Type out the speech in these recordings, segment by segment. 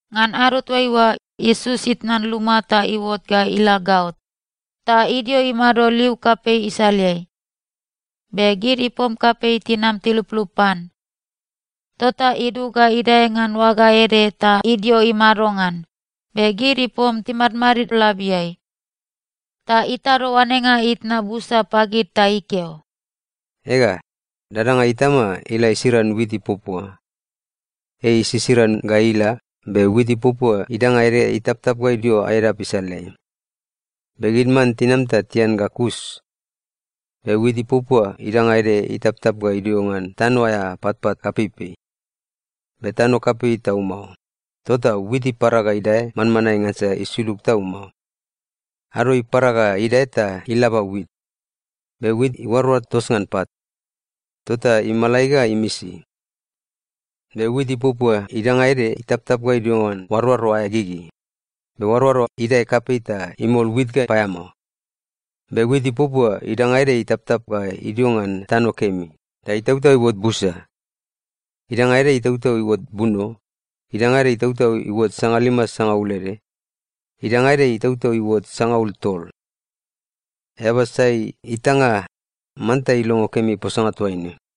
Ngan ado toaiua, Iesus itnan luma ta iuot ga ila gaot. Ta idio imado liu kapei isaleai. Be gid ipom kapei tinam tiluplup pan. Tota idug ga idae ngan oaga ede ta idio imado ngan, be gid ipom timadmadid labiai. Ta itado oanenga itna busa pagid ta ikeo, “Ega, dadanga itama ila isiran wit ipuapua. Ei isisiran ga ila, be wit ipuapua idanga ede itaptap ga idio edap isaleai. Be gid man tinam ta tian ga kus. Be wit ipuapua idanga ede itaptap ga idio ngan tano aea patpat kapeipei. Be tano kapei tau mao, tota wit ipara ga idae manmanae ngansa isulug tau mao. Ado ipara ga idae ta ilaba wit. Be wit iuaroar tos ngan pat, tota imalai ga imisi. Be wit ipuapua idanga ede itaptap ga idio ngan oaroaro aea gigi. Be oaroaro idae kapei ta imol wit ga paeamao. Be wit ipuapua idanga ede itaptap ga idio ngan tano kemi, ta itautau iuot busa. Idanga ede itautau iuot buno, idanga ede itautau iuot sangalima sangaul ede, idanga ede itautau iuot sangaul tol. Eaba sai itanga, manta ilongo kemi posanga toaine.”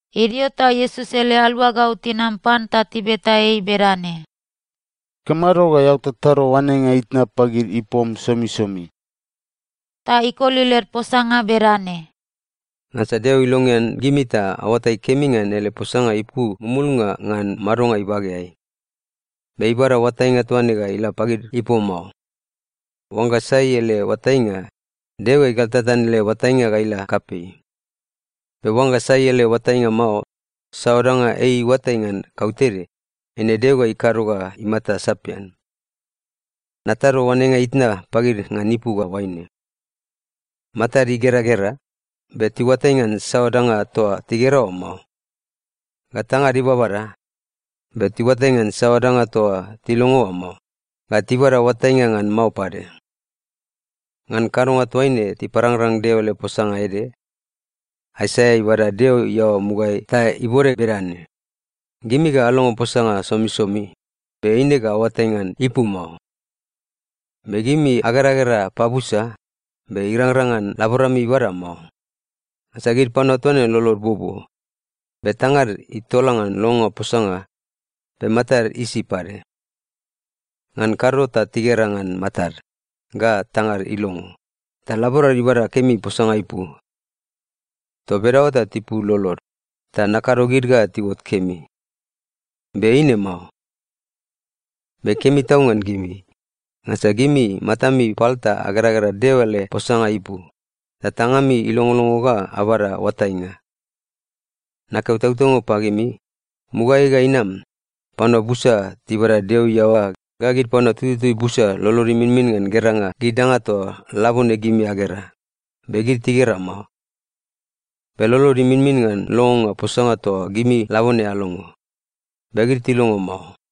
Idio ta Iesus ele aluagau tinam pan ta tibeta ei bedane, “Ikamado ga eao tatado oanenga itna pagid ipom somisomi?” Ta ikoli led posanga bedane, “Ngansa Deo ilongean gimi ta aoatai kemi ngan ele posanga ipu mumulnga ngan madonga ibageai. Be ibada oatainga toa ne ga ila pagid ipom mao. Oangga sai ele oatainga, Deo ga igaltatan ele oatainga ga ila kapei. Be oangga sai ele oatainga mao, saoa danga ei iuatai ngan kautede, eine Deo ga ikado ga imata sapian. Natado oanenga itna pagid ngan ipu ga oaine: “Matad igeragera, be tiuatai ngan saoa danga toa tigera oa mao. Ga tangad ibabada, be tiuatai ngan saoa danga toa tilongo oa mao, ga tibada oatainga ngan mao pade. Ngan kadonga toaine tiparangrang Deo ele posanga ede. Aisaia ibada Deo iaoa mugaeai ta ibode bedane, “‘Gimi ga alongo posanga somisomi, be eine ga aoatai ngan ipu mao. Be gimi ageragera pabusa, be irangrang ngan laborami ibada mao. Ngansa gid panua toa ne lolod buobuo, be tangad itola ngan longonga posanga. Be matad isi pade. Ngan kado ta tigera ngan matad, ga tangad ilongo ta laborad ibada kemi posanga ipu. Toa bedaoa ta tipul lolod, ta nakado gid ga tiuot kemi. Be eine mao.’ Be kemi tau ngan gimi! Ngansa gimi matami pal ta ageragera Deo ele posanga ipu, ga tangami ilongolongo ga abada oatainga. Nakeo tautaunga pagimi, mugaeai ga inam, panua busa tibada Deo iaoa ga gid panua tututui busa lolod iminmin ngan geranga gid danga toa labone gimi agera, be gid tigera mao. Be lolod iminmin ngan longonga posanga toa gimi labone alongo, be gid tilongo mao.”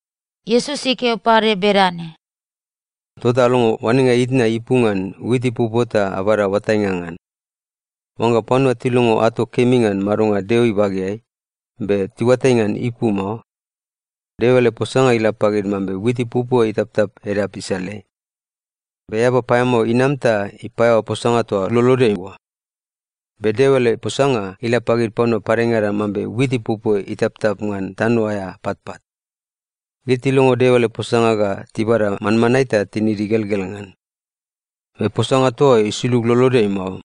Iesus ikeo pade bedane, “Tota alongo oanenga itna ipu ngan wit ipuapua ta abada oatainga ngan. Oangga panua tilongo ato kemi ngan madonga Deo ibageai, be tiuatai ngan ipu mao, Deo ele posanga ila pagid mambe wit ipuapua itaptap edap isaleai. Be eaba paeamao inam ta ipaeaoa posanga toa lolodeai oa. Be Deo ele posanga ila pagid panua padengada mambe wit ipuapua itaptap ngan tano aea patpat. Gid tilongo Deo ele posanga ga tibada manmanae ta tinid igelgel ngan. Be posanga toa oa isulug lolodeai mao,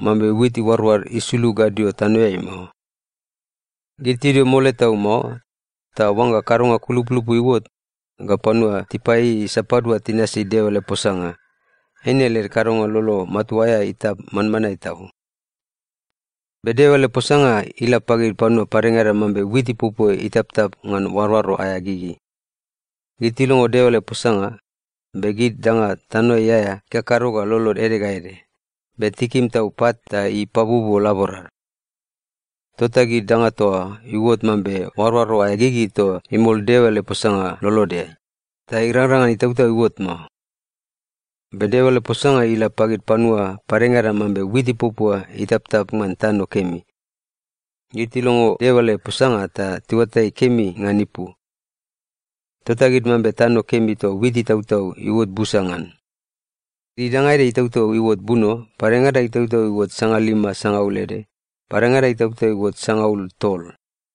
mambe wit iuaroar isulug gadio tanoeai mao. Gid tidio mole tau mao, ta oangga kadonga kulupulupu iuot, ga panua tipaieiei sapadua tinasi Deo ele posanga, eine led kadonga lolo matua aea itap manmanae tau. Be Deo ele posanga ila pagid panua padengada mambe wit ipuapua itaptap ngan oaroaro aea gigi. Gid tilongo Deo ele posanga, be gid danga tanoeai aea ikakado ga lolod ede ga ede, be tikim tau pat ta ipabuobuo laborad. Tota gid danga toa oa iuot mambe oaroaro aea gigi toa imol Deo ele posanga lolodeai, ta irangrang ngan itautau iuot mao. Be Deo ele posanga ila pagid panua padengada mambe wit ipuapua itaptap ngan tano kemi. Gid tilongo Deo ele posanga ta tiuatai kemi ngan ipu. Tota gid mambe tano kemi toa wit itautau iuot busa ngan. Idanga ede itautau iuot buno, padengada itautau iuot sangalima sangaul ede, padengada itautau iuot sangaul tol.”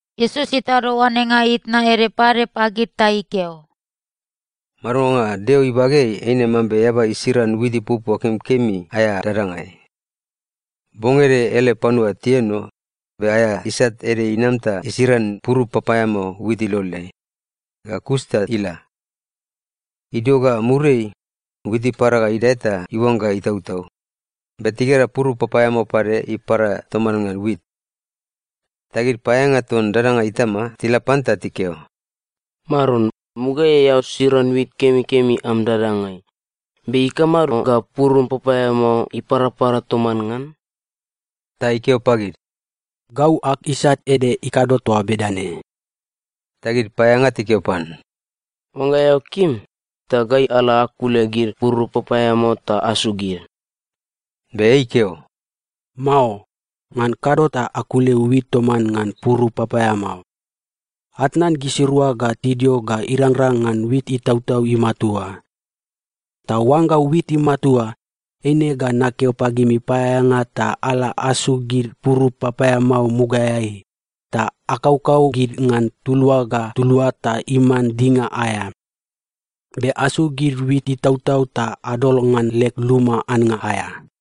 Iesus itado oanenga itna ede pade pagid ta ikeo, “Madonga Deo ibageai eine mambe eaba isiran wit ipuapua kemikemi aea dadangai. Bong ede ele panua tienono, be aea isat ede inam ta isiran purup papaeamao wit iloleai. Ga kus ta ila. Idio ga muriai, wit ipara ga idae ta iuangga itautau, be tigera purup papaeamao pade ipara toman ngan wit. “Ta gid paeaeanga ton dadanga itama tila pan ta tikeo, ‘Maron, mugaeai eao siran wit kemikemi am dadangai, be ikamado ga purup papaeamao iparapara toman ngan?’ “Ta ikeo pagid, ‘Gau ag isat ede ikado toa bedane.’ “Ta gid paeaeanga tikeo pan, ‘Oangga eao kim, ta gai ala akule gid purup papaeamao ta asuk gid.’ “Be ikeo, ‘Mao. Ngan kado ta akule wit toman ngan purup papaeamao. Atnan gisirua ga tidio ga irangrang ngan wit itautau imatua. Ta oangga wit imatua, eine ga nakeo pagimi paeaeanga ta ala asuk gid purup papaeamao mugaeai, ta akaukau gid ngan tulua ga tulua ta iman dinga aea. Be asuk gid wit itautau ta adol ngan leg luma annga aea.’”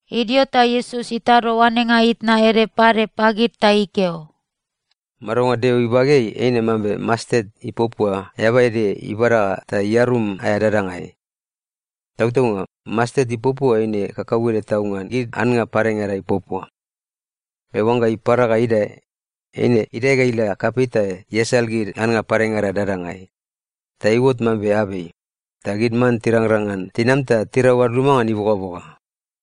Idio ta Iesus itado oanenga itna ede pade pagid ta ikeo, “Madonga Deo ibageai eine mambe mastet ipuapua eaba ede ibada ta iarum aea dadangai. Tautaunga, mastet ipuapua eine kakauede tau ngan gid annga padengada ipuapua. Be oangga ipara ga idae, eine idae ga ila kapei ta iasal gid annga padengada dadangai. Ta iuot mambe abei, ta gid man tirangrang ngan tinam ta tirau ad luma ngan ibogaboga.”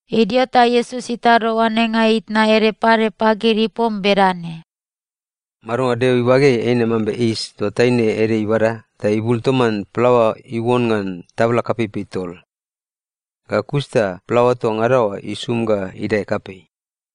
Idio ta Iesus itado oanenga itna ede pade pagid ipom bedane, “Madonga Deo ibageai eine mambe yis toa taine ede ibada, ta ibul toman plaoa iuon ngan tabla kapeipei tol. Ga kus ta plaoa toa ngada oa isum ga idae kapei.”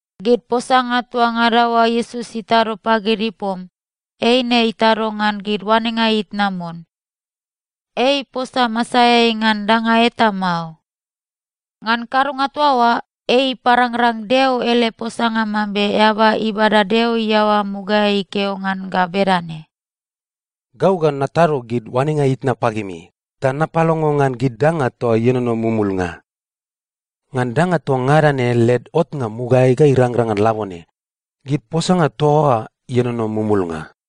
Gid posanga toa ngada oa Iesus itado pagid ipom, eine itado ngan gid oanenga itna mon. Ei iposa masaeai ngan danga eta mao. Ngan kadonga toa oa, ei iparangrang Deo ele posanga mambe eaba ibada Deo iaoa mugaeai ikeo ngan ga bedane, “Gau ga natado gid oanenga itna pagimi ta napalongo ngan gid danga toa ienono mumulnga. Ngan danga toa ngada ne led otnga mugaeai ga irangrang ngan labone, gid posanga toa oa ienono mumulnga.”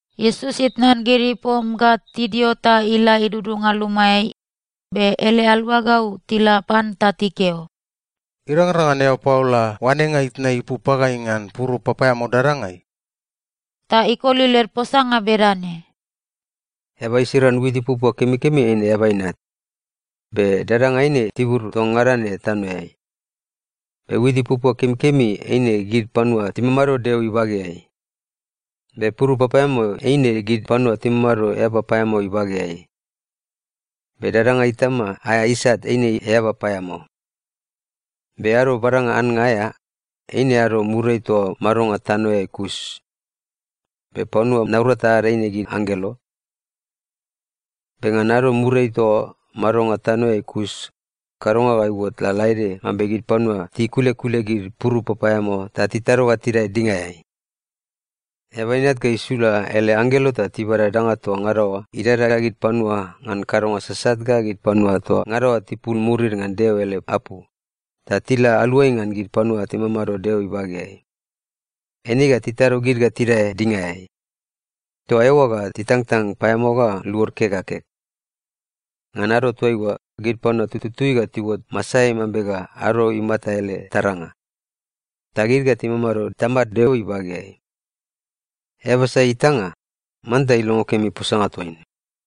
Iesus itnan gid ipom ga tidio ta ila idudunga lumaeai. Be ele aluagau tila pan ta tikeo, “Irangrang ngan eao paola oanenga itna ipu pagai ngan purup papaeamao dadangai?” Ta ikoli led posanga bedane, “Eaba isiran wit ipuapua kemikemi eine Eaba Inat. Be dadanga eine tibur toa ngada ne tanoeai. Be wit ipuapua kemikemi eine gid panua timamado Deo ibageai. Be purup papaeamao eine gid panua timamado eaba paeamao ibageai. Be dadanga itama aea isat eine eaba paeamao. Be ado badanga annga aea, eine ado muriai toa madonga tanoeai kus. Be panua naurata ad eine gid anggelo. “Be ngan ado muriai toa madonga tanoeai kus, kadonga ga iuot lalaede mambe gid panua tikulekule gid purup papaeamao ta titado ga tidae dingaeai. Eaba Inat ga isula ele anggelo ta tibada danga toa ngada oa idadada gid panua ngan kadonga sasat ga gid panua toa ngada oa tipul murid ngan Deo ele apu, ta tila aluai ngan gid panua timamado Deo ibageai. Eine ga titado gid ga tidae dingaeai. Toa eoa ga titangtang paeamao ga luod kek ga kek. Ngan ado toaiua, gid panua tututui ga tiuot masaeai mambe ga ado imata ele taranga. Ta gid ga timamado Tamad Deo ibageai. Eaba sai itanga, manta ilongo kemi posanga toaine.”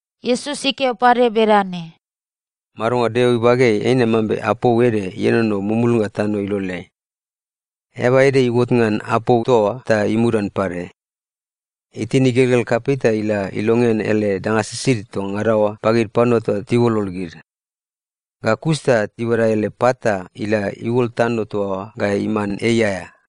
Iesus ikeo pade bedane, “Madonga Deo ibageai eine mambe apou ede ienono mumulnga tano iloleai. Eaba ede iuot ngan apou toa oa ta imudan pade. Itin igelgel kapei ta ila ilongean ele danga sisid toa ngada oa pagid panua ta tiuolol gid. Ga kus ta ibada ele pat ta ila iuol tano toa oa ga iman ei aea.”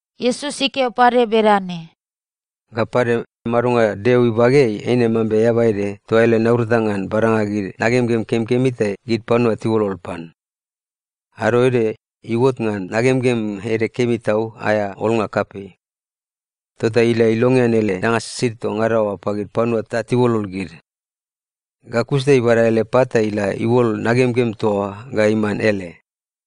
Iesus ikeo pade bedane, “Ga pade, madonga Deo ibageai eine mambe eaba ede toa ele naurata ngan badanga gid nagemgem kemikemi ta gid panua tiuolol pan. Ado ede iuot ngan nagemgem ede kemi tau aea olnga kapei. Tota ila ilongean ele danga sisid toa ngada oa pagid panua ta tiuolol gid. Ga kus ta ibada ele pat ta ila iuol nagemgem toa oa ga iman ele.”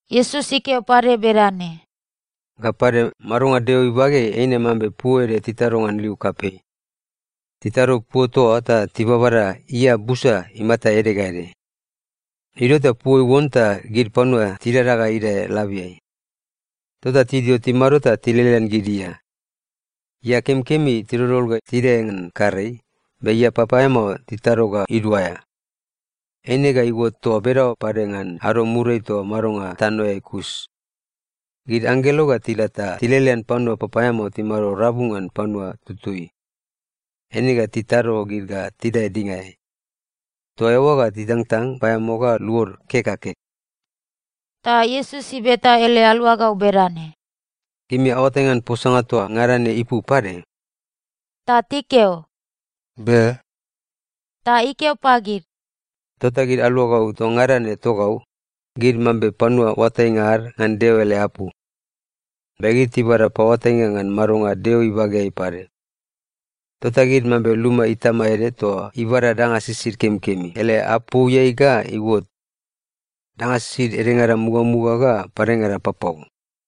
Iesus ikeo pade bedane, “Ga pade, madonga Deo ibageai eine mambe puo ede titado ngan liu kapei. Titado puo toa oa ta tibabada ia busa imata ede ga ede. Idio ta puo iuon, ta gid panua tidada ga idae labiai. Tota tidio timado ta tilelean gid ia. Ia kemikemi tidoldol ga tidae ngan karei, be ia papaeamao titado ga iduaea. Eine ga iuot toa bedaoa pade ngan ado muriai toa madonga tanoeai kus. Gid anggelo ga tila ta tilelean panua papaeamao timamado rabu ngan panua tututui. Eine ga titado gid ga tidae dingaeai. Toa eoa ga titangtang paeamao ga luod kek ga kek.” Ta Iesus ibeta ele aluagau bedane, “Gimi aoatai ngan posanga toa ngada ne ipu pade?” Ta tikeo, “Be.” Ta ikeo pagid, “Tota gid aluagau toa ngada ne togau, gid mambe panua oatainga ad ngan Deo ele apu. Be gid tibada paoatainga ngan madonga Deo ibageai pade. Tota gid mambe luma itama ede toa ibada danga sisid kemikemi ele apouiai ga iuot. Danga sisid edengada mugamuga ga padengada papau.”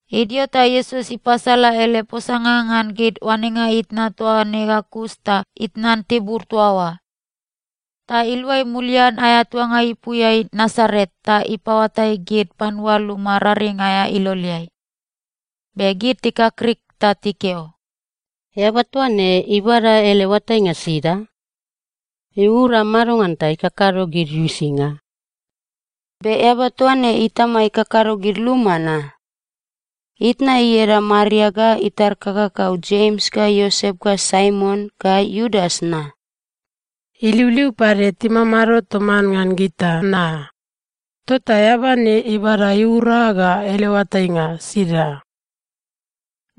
Idio ta Iesus ipasala ele posanga ngan gid oanenga itna toa ne ga kus ta itnan tibur toa oa. Ta iluai mulian aea tuanga ipuiai Nasaret ta ipaoatai gid panua luma raring aea iloleai. Be gid tikakrik ta tikeo, “Eaba toa ne ibada ele oatainga sida? Iura madongan ta ikakado gid uisinga? Be eaba toa ne itama ikakado gid luma na? Itna ieda Maria ga itar kakakau Jems ga Iosep ga Saimon ga Iudas na? Iliuliu pade timamado toman ngan gita na? Tota eaba ne ibada iura ga ele oatainga sida?”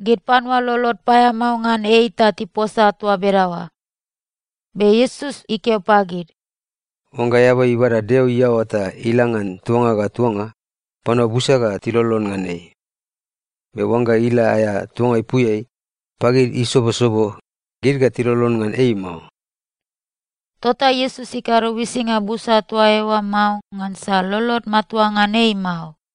Gid panua lolod paeamao ngan ei ta tiposa toa bedaoa. Be Iesus ikeo pagid, “Oangga eaba ibada Deo iaoa ta ila ngan tuanga ga tuanga, panua busa ga tilolon ngan ei. Be oangga ila aea tuanga ipuiai, pagid isobosobo, gid ga tilolon ngan ei mao.” Tota Iesus ikado uisinga busa toa eoa mao ngansa lolod matua ngan ei mao.